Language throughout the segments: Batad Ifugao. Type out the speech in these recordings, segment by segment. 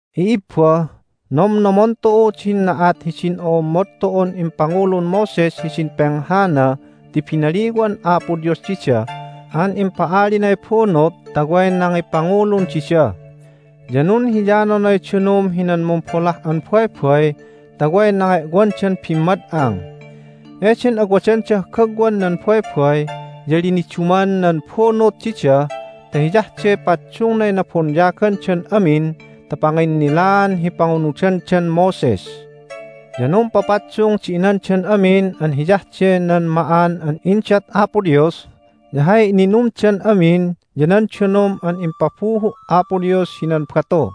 I'ibba, nomnomon tu'u din na'at hidin o'ommod tu'un impangulun Moses hidin penghana ti binaliwan Apo Dios dida an impa'alinay bunut ta way nangipangulun dida. Ya nunhiyanonay danum hinan Mumbolah an Baybay ta way nange'wandan bimmad'ang. Eden awadandah gagwan nan baybay ya liniduman nan bunut dida ta hiyah de paddungnay nabonyagandan amin ta panginnilaan hi pangunudandan Moses. Ya numpapaddung di inandan amin an hiyah de nan ma'an an indat Apo Dios, ya hay ininumdan amin ya nan danum an impabuhu' Apo Dios hinan batu.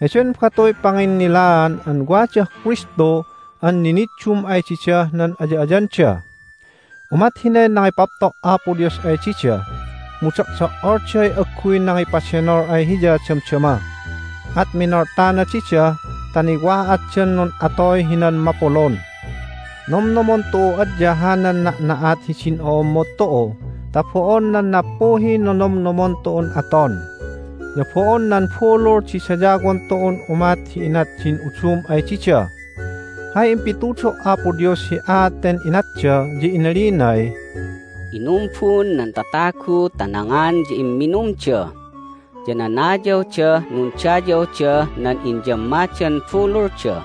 Heden batuy panginnilaan an wadah Kristu an niniddum ay didah nan aya'ayanda. Umat hinay nangipapto' Apo Dios ay dida, mu do'do"olday agguy nangipadenol ay Hiya damdama, at minoltana dida ta niwa'atdan nun'atoy hinan mapulun. Nomnomon tu'u adya hanan na'na'at hidin o'ommod tu'u ta bo'on nan nappuhiy nonomnomon tu'un aton. Ya bo'on nan bulul di dayawon tu'un umat hi inat din udum ay dida. Hay impitudo' Apo Dios hi aat ten inatda ya inalinay, "Inumbun nan tatagu ta nangan ya imminumda, ya nanayawdah nundayawdah nan inyammadan bululda."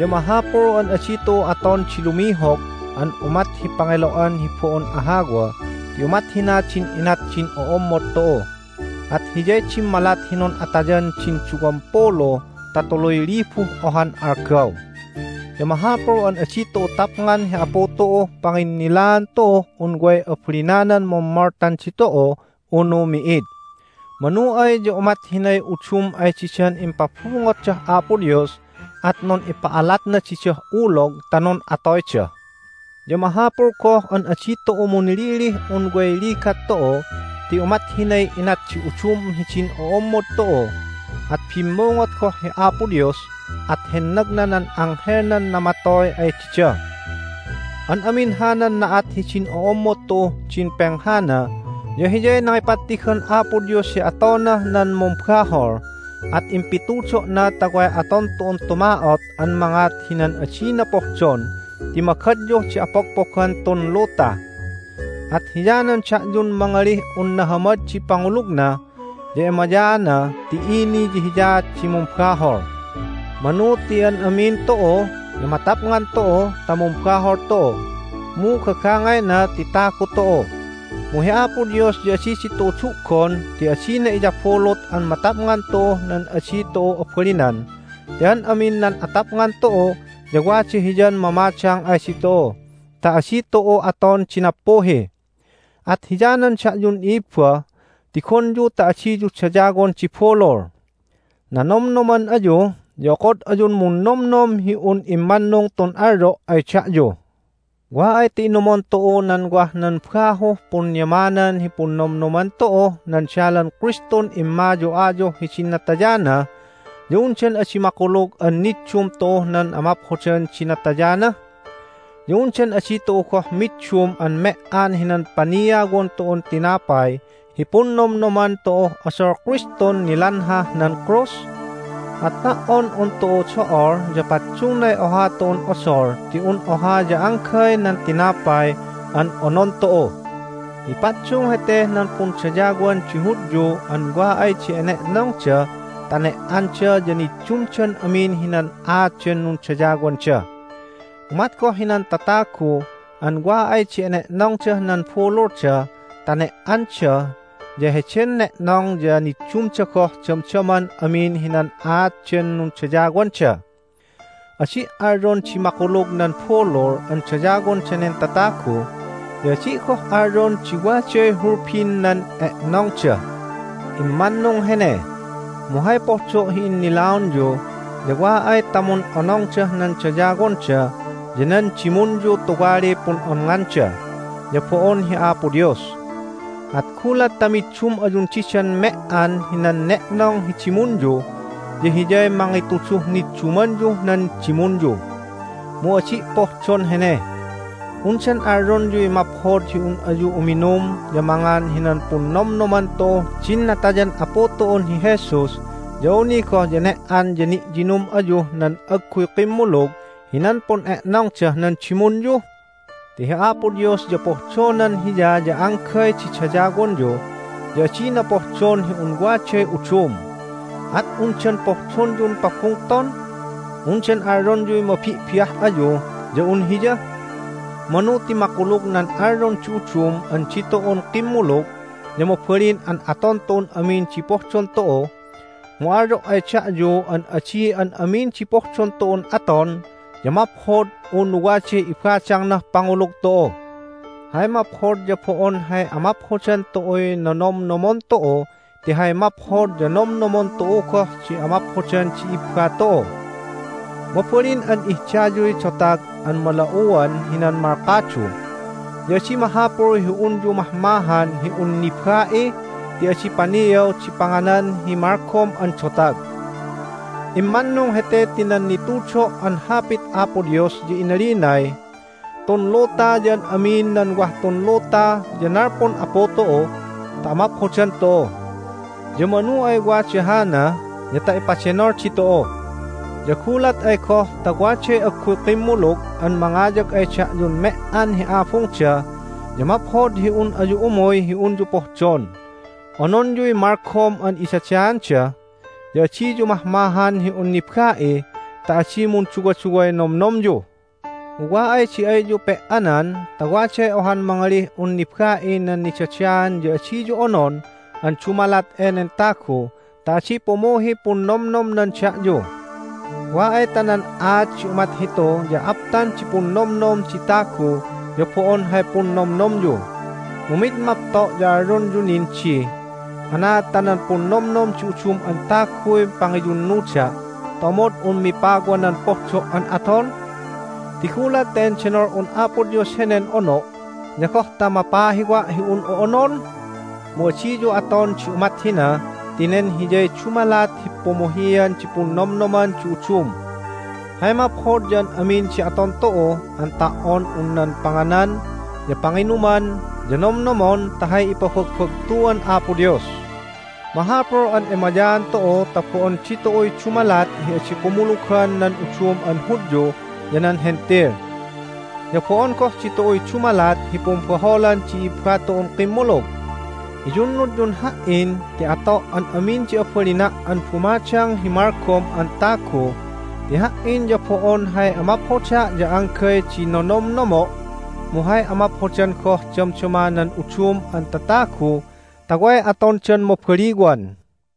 Ya mahapul an adi tu'u aton di lumihog an umat hi pangelo'an hi bo'on ahawa ti umat hina din inat din o'ommod tu'u, at hiyay dimmalat hi nun'atayan din duwampulu ta tuluy libuh ohan algaw. Ya mahapul an adi tu'u tapngan hi Apu tu'uh panginnilaan tu'uh un way abalinanan mummoltan ditu'u unu mi'id. Manu ay ya umat hinay udum ay didan impabungotdah Apo Dios, at nun'ipa'alatna didah ulog ta nun'atoyda. Ya mahapul goh an adi tu'u munlilih un way ligat tu'u ti umat hinay inat di udum hidin o'ommod tu'u, at bimmungot goh hi Apo Dios, at hennagna nan anghelnan namatoy ay dida. An amin hanan na'at hidin o'ommod tu'uh din penghana ya hiyay nangipattigan Apo Dios hi atonah nan mumbahol, at impitudo'na ta way aton tu'un tuma'ot an mangat hinan adina pohdon ti magadyuh di apogpogan tun luta. At hiyanan da'yun mangalih un nahamad di pangulugna ya emayaana ti ini ya hiyaat di mumbahol! Manu ti an amin tu'u ya matapngan tu'u ta mumbahol tu'u, mu gagangayna ti tagu tu'u. Mu hi Apo Dios ya adi ditu'u du'gon ti adina iyabulut an matapngan tu'uh nan adi tu'u abalinan ti an amin nan atapngan tu'u ya wada Hiyan mamadang ay ditu'u ta adi tu'u aton di nappuhi. At hiyanan da'yun i'ibba, tigonyu ta adiyu dayawon di bulul. Nanomnoman ayu, ya okod ayun munnomnom hi un immannung tun alyo' ay da'yu. Wa ay ta inumon tu'u nan wah nan bahuh punyamanan hi Punnomnoman tu'uh nan Dalan Kristun Immayu'ayuh hidin Natayana ya undan adi makulug an niddum tu'uh nan amaphodan di natayana? Ya undan adi tu'u goh middum an me"an hinan paniawon tu'un tinapay hi Punnomnoman tu'uh Odol Kristun Nilanhah nan Krus? At ta"on un tu'u do'ol ya paddungnay oha tu'un odol ti un oha ya anggay nan tinapay an onon tu'u. Mipaddung heteh nan pundayawan di Hudyu an wa ay di ene'nongda ta ne"anda ya niddumdan amin hinan aat den nundayawanda. Umat goh hinan tatagu an wa ay di ene'nongdah nan bululda ta ne"anda ya heden ne'nong ya niddumda goh damdaman amin hinan aat den nundayawanda. Adi' alyon di makulug nan bulul an dayawon danen tatagu, ya adi' goh alyon di waday hulbin nan e'nongda. Immannung hene. Mu hay pohdo' hi innilaonyu ya wa ay ta mun'onongdah nan dayawonda ya nan dimunyu tuwaliy pun'onnganda, ya bo'on hi Apo Dios. At gulat ta middum ayun didan me"an hinan ne'nong hi dimunyu ya hiyay mangituduh niddumanyuh nan dimunyu. Mu adi' pohdon hene. Undan alyonyuy maphod hi un ayu uminum ya mangan hinan Punnomnoman tu'uh din Natayan Apu tu'un hi Jesus ya awni goh ya ne"an ya ni'yinum ayuh nan agguy kimmulug hinan pun'e'nongdah nan dimunyu? Ti hi Apo Dios ya pohdonan Hiya ya anggay di dayawonyu, ya adina pohdon hi un waday udum. At undan pohdonyun pabungton? Undan alyonyuy mabi'bi'ah ayu ya un Hiya? Manu ti makulug nan alyon di udum an ditu'un kimmulug ya mabalin an aton tu'un amin di pohdon tu'u, mu alyo' ay da'yu an adi an amin di pohdon tu'un aton ya maphod unu waday ibadangnah pangulug tu'u. Hay maphod ya bo'on hay amaphodan tu'uy nonomnomon tu'u ti hay maphod ya nomnomon tu'u goh di amaphodan di i'ibba tu'u. Mabalin an ihdayuy dotag an mala'uwan hinan malkadu. Ya adi mahapul hi unyu mahmahan hi un niba'i ti adi paniaw di panganan hi malgom an dotag. Immannung hete ti nan nitudo' an Hapit Apo Dios ya inalinay, "Tun luta ya an amin nan wah tun luta ya nalpun Apu tu'u ta amaphodan tu'u." Ya manu ay wada hana ya ta ipadenol ditu'u. Ya gulat ay goh ta waday agguy kimmulug an mangayag ay da'yun me"an hi abungda ya maphod hi un ayu umuy hi unyu pohdon. Ononyuy malgom an idadaanda, ya adiyu mahmahan hi un niba'i ta adi munduwaduway nomnomyu. Mu wa ay di ayyu pe"anan ta waday ohan mangalih un niba'i nan nidadaan ya adiyu onon an dumalat enen tagu ta adi pumuhiy punnomnomnan da'yu. Wa ay ta nan aat di umat hitu ya aptan di punnomnom di tagu ya bo'on hay punnomnomyu. Mu mid mapto' ya alyonyu nin di, "Anaad ta nan punnomnom di udum an taguy pangiyunnuda' ta omod un mipawa nan pohdo' an aton? Ti gulat ta endenol'un Apo Dios henen ono' ya goh ta mapahiwa' hi un'u onon?" Mu adiyu aton di umat hina ti nen hiyay dumalat hi pumuhian di punnomnoman di udum. Hay maphod ya an amin di aton tu'u an ta"on un nan panganan ya panginuman ya nomnomon ta hay ipabagbagtuan Apo Dios. Mahapul an emayaan tu'u ta bo'on ditu'uy dumalat hi adi kumulugan nan udum an Hudyu ya nan Hentil, ya bo'on goh ditu'uy dumalat hi pumbaholan di i'ibba tu'un kimmulug. Iyunnudyun ha"in ti ato' an amin di abalina' an bumadang hi malgom an tagu ti ha"in ya bo'on hay amaphoda' ya anggay di nonomnomo', mu hay amaphodan goh damdama nan udum an tatagu ta way atondan mabaliwan.